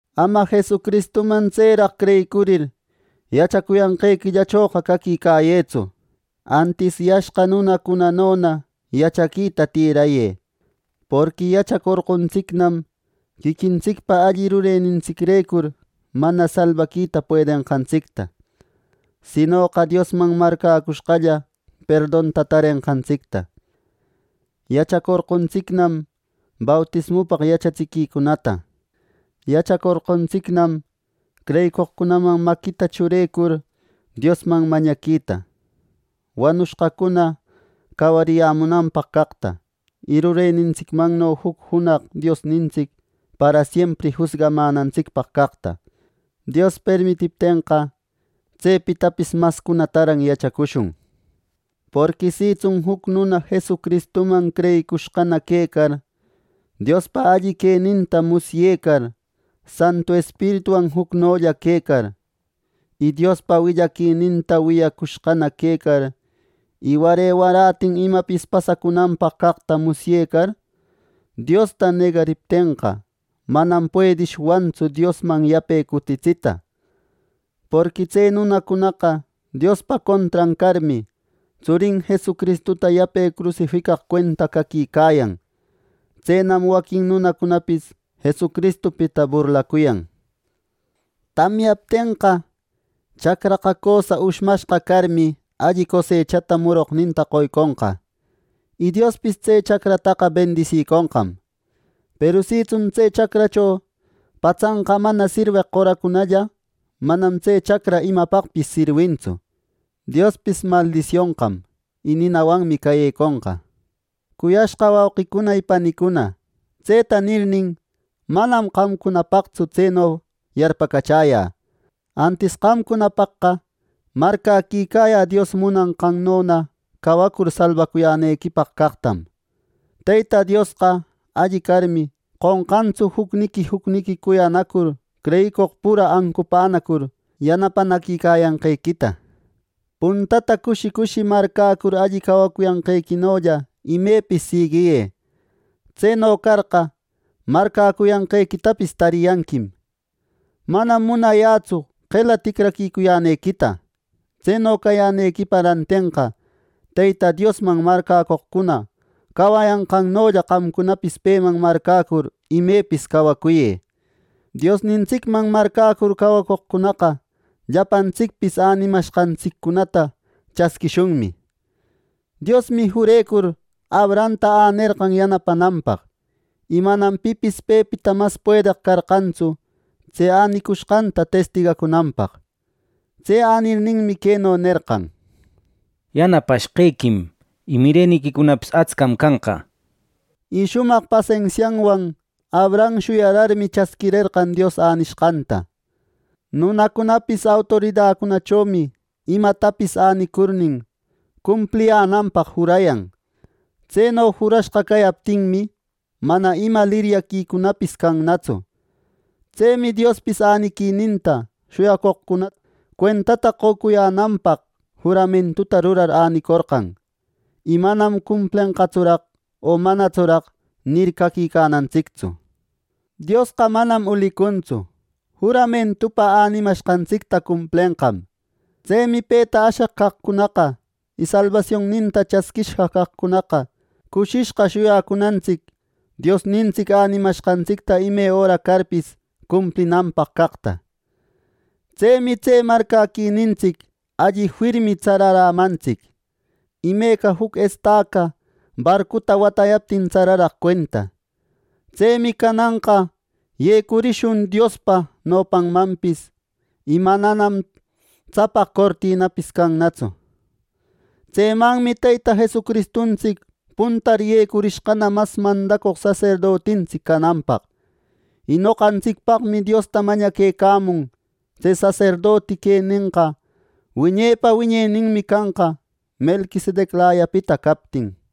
Ama Jesucristuman tseraq creyicurir, yachacuyanqequillachoqa caquicayëtsu. Antis yashqa nunacunanona yachaquita tirayë. Porqui yachacorqontsicnam quiquintsicpa alli rurenintsicrecur mana salbaquita puedenqantsicta, sinoqa Diosman marcäcushqalla perdonta tarenqantsicta. Yachacorqontsicnam bautismupaq yachatsiquicunata. Yachacorqontsicnam creyicoqcunaman maquita churecur Diosman mañaquita, wanushqacuna cawariyämunanpaq caqta, y rurenintsicmanno juc junaq Diosnintsic parasiempri jusgamänantsicpaq caqta. Dios permitiptenqa, tsepitapis mascunataran yachacushun. Porqui sitsun juc nuna Jesucristuman creyicushqana quecar, Diospa alli queninta musyecar, Santu Espirituwan jucnolla quecar, y Diospa alli willaquininta wiyacushqana quecar y ware waratin imapis pasacunanpaq caqta musyecar, Diosta negariptenqa, manam puedishwannatsu Diosman yape cutitsita. Porqui tse nunacunaqa Diospa contran carmi, Tsurin Jesucristuta yape crusificaq cuenta caquicayan. Tsenam waquin nunacunapis Jesucristupita burlacuyan. Tamyaptenqa, chacraqa cösa ushmashqa carmi, alli cosechata muroqninta qoyconqa, y Diospis tse chacrataqa bendisiconqam. Peru sitsun tse chacracho patsanqa mana sirweq qoracunalla, manam tse chacra imapaqpis sirwintsu, Diospis maldisionqam, y ninawanmi cayeconqa. Cuyashqa wauqicuna y panicuna, tseta nirnin manam qamcunapaqtsu tseno yarpacachäyä. Antis qamcunapaqqa marcäquicayä Dios munanqannona cawacur salbacuyänequipaq caqtam. Teyta Diosqa alli carmi, qonqantsu jucniqui jucniqui cuyanacur creyicoq pura ancupänacur yanapanaquicayanqequita. Puntata cushi cushi marcäcur alli cawacuyanqequinolla imepis siguiyë. Tseno carqa marcäcuyanqequitapis tariyanquim. Manam munayätsu qela ticraquicuyänequita. Tseno cayänequipa rantenqa Teyta Diosman marcäcoqcuna cawayanqannolla qamcunapis peman marcäcur imepis cawacuyë. Dionintsicman marcäcur cawacoqcunaqa llapantsicpis änimashqantsiccunata chasquishunmi. Diosmi jurecur Abrahamta änerqam yanapananpaq, y manam pipis pepita mas puedeq carqantsu tse änicushqanta testigacunanpaq. Tse änirninmi queno nerqan: “Yanapashqequim, y mireniquicunapis astcam canqa” nir. Y shumaq pasensianwan Abraham shuyararmi, chasquirerqan Dios änishqanta. Nunacunapis autoridacunachomi imatapis änicurnin, cumpliyänanpaq jurayan. Tseno jurashqa cayaptinmi, mana ima liryaquicunapis cannatsu. Tsemi Diospis äniquininta shuyacoqcuna cuentata qocuyänanpaq juramentuta rurar änicorqan. Y manam “¿Cumplenqatsuraq o manatsuraq?” nir, caquicanantsictsu. Diosqa manam ulicuntsu. Juramentupa änimashqantsicta cumplenqam. Tsemi peta asheq caqcunaqa y salbasionninta chasquishqa caqcunaqa, cushishqa shuyacunantsic Diosnintsic änimashqantsicta ime öra carpis cumplinanpaq caqta. Tsemi tse marcäquinintsic alli firmi tsararämantsic, imeca juc estaca barcuta watäyaptin tsararaq cuenta. Tsemi cananqa yecurishun Diospa nopanmanpis y mananam tsapaq cortinapis cannatsu. Tsemanmi Teyta Jesucristuntsic puntar yecurishqana mas mandacoq saserdotintsic cananpaq. Y noqantsicpaqmi Diosta mañaquecamun. Tse saserdoti quenenqa wiñepa wiñeninmi canqa Melquisedeclayapita captin.